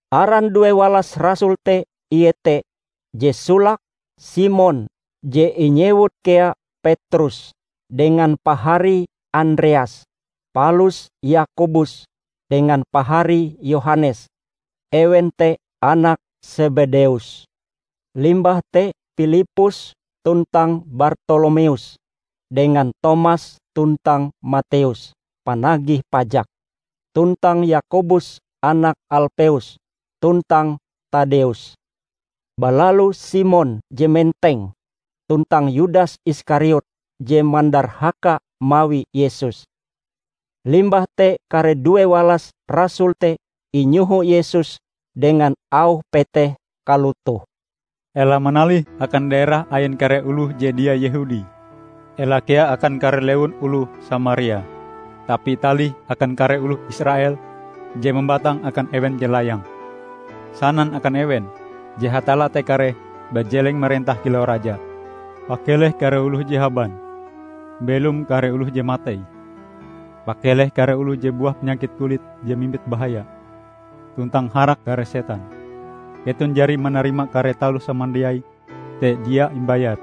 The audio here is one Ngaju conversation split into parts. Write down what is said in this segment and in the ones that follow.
Aran due walas rasul te ie te: je solake, Simon (je inyewut kea Petrus) dengan paharie Andreas, palus Yakobus dengan paharie Yohanes, ewen te anak Sebedeus. Limbah te Pilippus tuntang Bartolomeus, dengan Tomas tuntang Mateus, panagih pajak, tuntang Yakobus anak Alpeus, tuntang Taddeus; balalu Simon je Menteng, tuntang Yudas Iskariot je mandarhaka mawi Yesus. Limbah te kare due walas rasul te inyoho Yesus dengan auh peteh kalotoh, "Ela manalih akan daerah ain kare oloh je dia Yehudi. Ela kea akan kare lewun oloh Samaria. Tapi talih akan kare oloh Israel, je mambatang akan ewen je layang. Sanan akan ewen je Hatalla te kareh bajeleng marentah kilau Raja. Pakeleh kare oloh je haban; mbelom kare oloh je matei; pakeleh kare oloh je buah panyakit kulit je mimbit bahaya, tuntang harak kare setan. Keton jari manarima kare taloh samandiai te dia imbayar.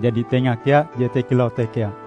Jadi tenga kea jete kilau te kea.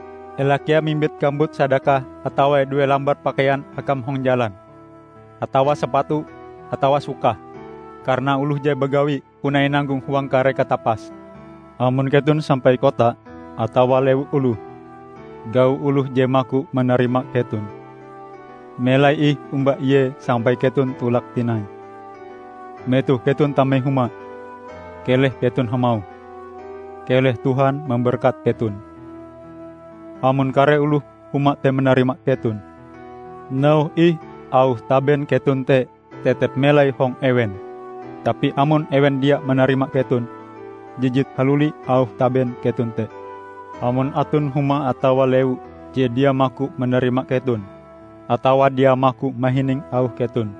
Ela kea mimbit kambut sadakah atawa due lambar pakaian akam hong jalan, atawa sapatu, atawa sukah. Karana oloh je bagawi, puna inanggong huang kare katapase. Amon keton sampai kota atawa lewun oloh, gau oloh je maku manarima keton. Melai ih omba ie sampai keton tolak tinai. Metoh keton tame huma, keleh keton hamauh, 'Keleh Tuhan mamberkat keton.' Amon kare oloh huma te manarima keton, nauhe ih auh taben keton te tetep melai hong ewen. Tapi amon ewen dia manarima keton, jijit haluli auh taben keton te. Amon aton huma atawa lewu je dia maku manarima keton atawa dia maku mahining auh keton,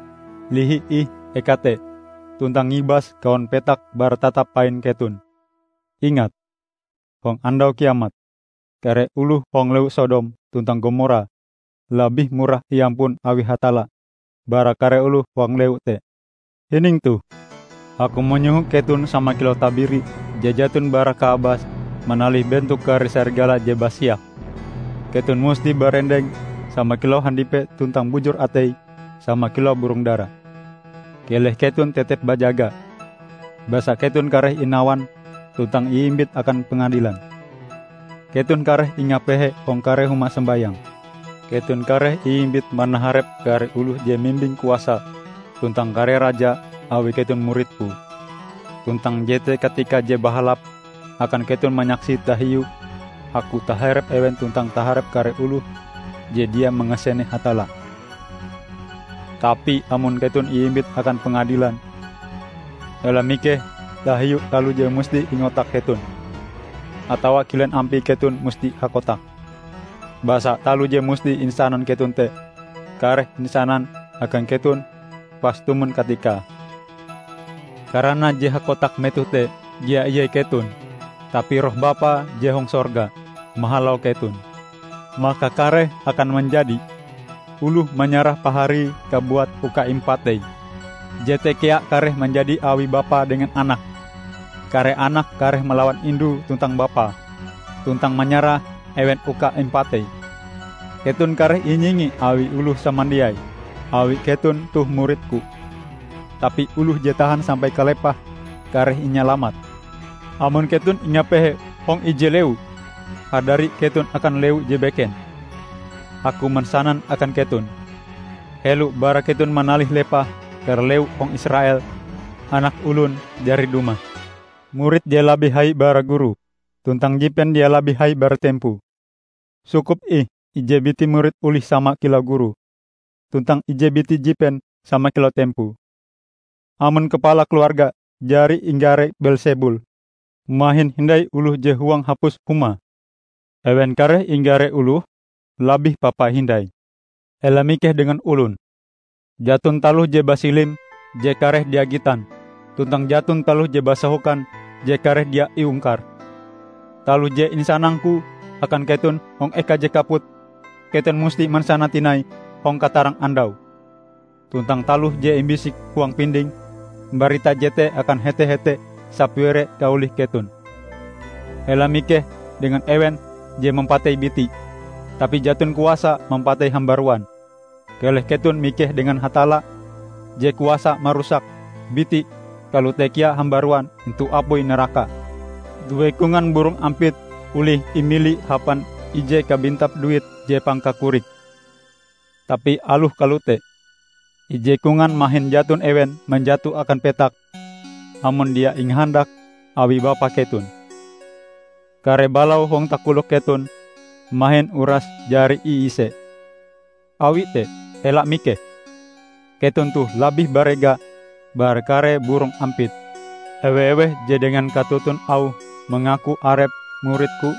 lihi ih eka te tuntang ngibas kawon petak bara tatap pain keton. Ingat! Hong Andau Kiamat, kare oloh hong lewu Sodom tuntang Gomora labih murah iampun awi Hatalla, bara kare oloh hong lewu te!" "Hining toh: Aku manyoho keton sama kilau tabiri je jaton bara kaabas manalih bentok kare sarigala je basiak. Keton musti barendeng sama kilau handipe tuntang bujur atei sama kilau burong dara. Keleh keton tetep bajaga, basa keton kareh inawan tuntang iimbit akan pengadilan. Keton kareh ingapehe hong kare huma sombayang. Keton kareh iimbit manaharep kare oloh je mimbing kuasa tuntang kare raja awi keton murid-Ku. Tuntang jete katika je bahalap akan keton manyaksi tahiu Aku taharep ewen tuntang taharep kare oloh je dia mangasene Hatalla. Tapi amon keton iimbit akan pengadilan, ela mikeh tahiu taloh je musti ingotak keton, atawa kilen ampie keton musti hakotak. Basa taloh je musti insanan keton te, kareh insanan akan keton pas tumon katikae. Karana je hakotak metoh te dia ie keton, tapi Roh Bapa je hong sorga, mahalau keton. Maka kareh akan manjadi: oloh manyarah paharie kabuat uka impatei. Jete kea kareh manjadi awi bapae dengan anake. Kare anak kareh malawan indue tuntang bapae, tuntang manyarah ewen uka impatei. Keton kareh inyingi awi oloh samandiai awi keton toh murid-Ku. Tapi oloh je tahan sampai kalepahe kareh inyalamat. Amon keton ingapehe hong ije lewu, hadari keton akan lewu je beken. Aku mansanan akan keton: Helo bara keton manalih lepah kare lewu hong Israel, Anak Olon jari dumah. Murid dia labih hai bara gurue, tuntang jipen dia labih hai bara tempoe. Sukup ih ije biti murid olih sama kilau gurue, tuntang ije biti jipen sama kilau tempoe. Amon kapala keluarga jari inggare Beelsebul, mahin hindai oloh je huang hapus humae. Ewen kareh inggare oloh labih papa hindai!" "Ela mikeh dengan olon. Jaton taloh je basilim, je kareh dia gitan, tuntang jaton taloh je basahokan, je kareh dia iungkar. Taloh je insanang-Ku akan keton hong eka je kaput keton musti mansanae tinai hong katarang andau. Tuntang taloh je imbisik huang pindingm, mbarita jete akan hete-hete sapire kaolih keton! Ela mikeh dengan ewen je mampatei biti, tapi jaton kuasae mampatei hambaruan. Keleh keton mikeh dengan Hatalla je kuasa marusak biti kalote kea hambaruan intu apui naraka. Due kongan burong ampit olih imili hapan ije kabintap duit je pangkakorike. Tapi aloh kalote, ije kongan mahin jaton ewen manjato akan petak amon dia ingahandak awi Bapa keton. Kare balau hong takolok keton mahin uras jari iise. Awi te, ela mikeh! Keton toh labih barega bara kare burong ampit!" "Ewe-eweh je dengan katoton auhe mangaku arepe murid-Ku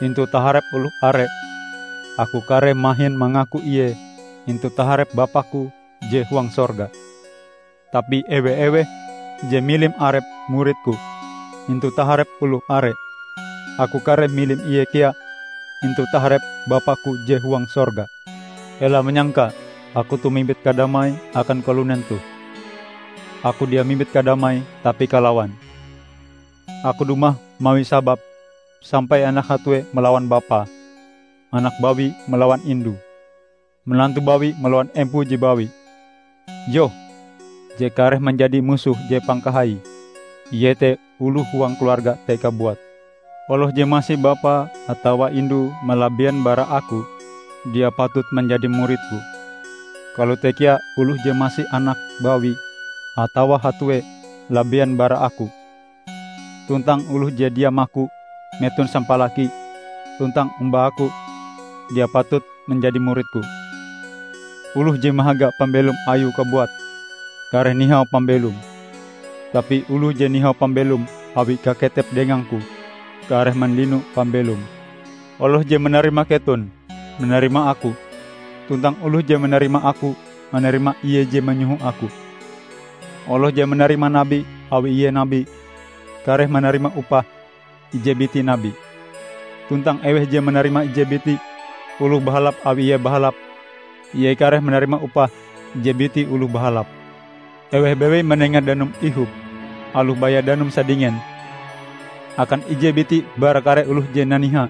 intu taharep oloh are, Aku kareh mahin mangaku ie intu taharep Bapa-Ku je huang sorga. Tapi ewe-eweh je milim arepe murid-Ku intu taharep oloh are, Aku kareh milim ie kea intu taharep Bapa-Ku je huang sorga." "Ela manyangka Aku toh mimbit kadamai akan kalunen toh. Aku dia mimbit kadamai tapi kalawan. Aku dumah mawi sabab sampai anak hatue malawan bapae, anak bawi malawan indue, manantu bawi malawan empoe je bawi. Yoh, je kareh manjadi musoh je pangkahaie, iete oloh huang keluarga te kabuat. Oloh je masi bapae atawa indue malabien bara Aku, dia patut manjadi murid-Ku. Kalote kea oloh je masi anake bawi atawa hatue labien bara Aku. Tuntang oloh je dia maku meton sampalakie tuntang omba Aku, dia patut manjadi murid-Ku. Oloh je mahaga pambelom ayue kabuat, kareh nihau pambelome, tapi oloh je nihau pambelome awi kaketepe dengang-Ku, kareh mandino pambelome." "Oloh je manarima keton, manarima Aku, tuntang oloh je manarima Aku, manarima Ie je manyoho Aku, Oloh je manarima nabi awi ie nabi, kareh manarima upah ije biti nabi. Tuntang eweh je manarima ije biti oloh bahalap awi ie bahalap, ie kareh manarima upah ije biti oloh bahalap. Eweh bewei manenga danum ihop, aloh baya danum sadingen, akan ije biti bara kare oloh je naniha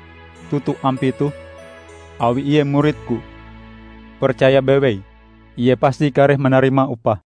toto ampie toh, awi ie murid-Ku, percaya bewei ie pasti kareh manarima upahe!"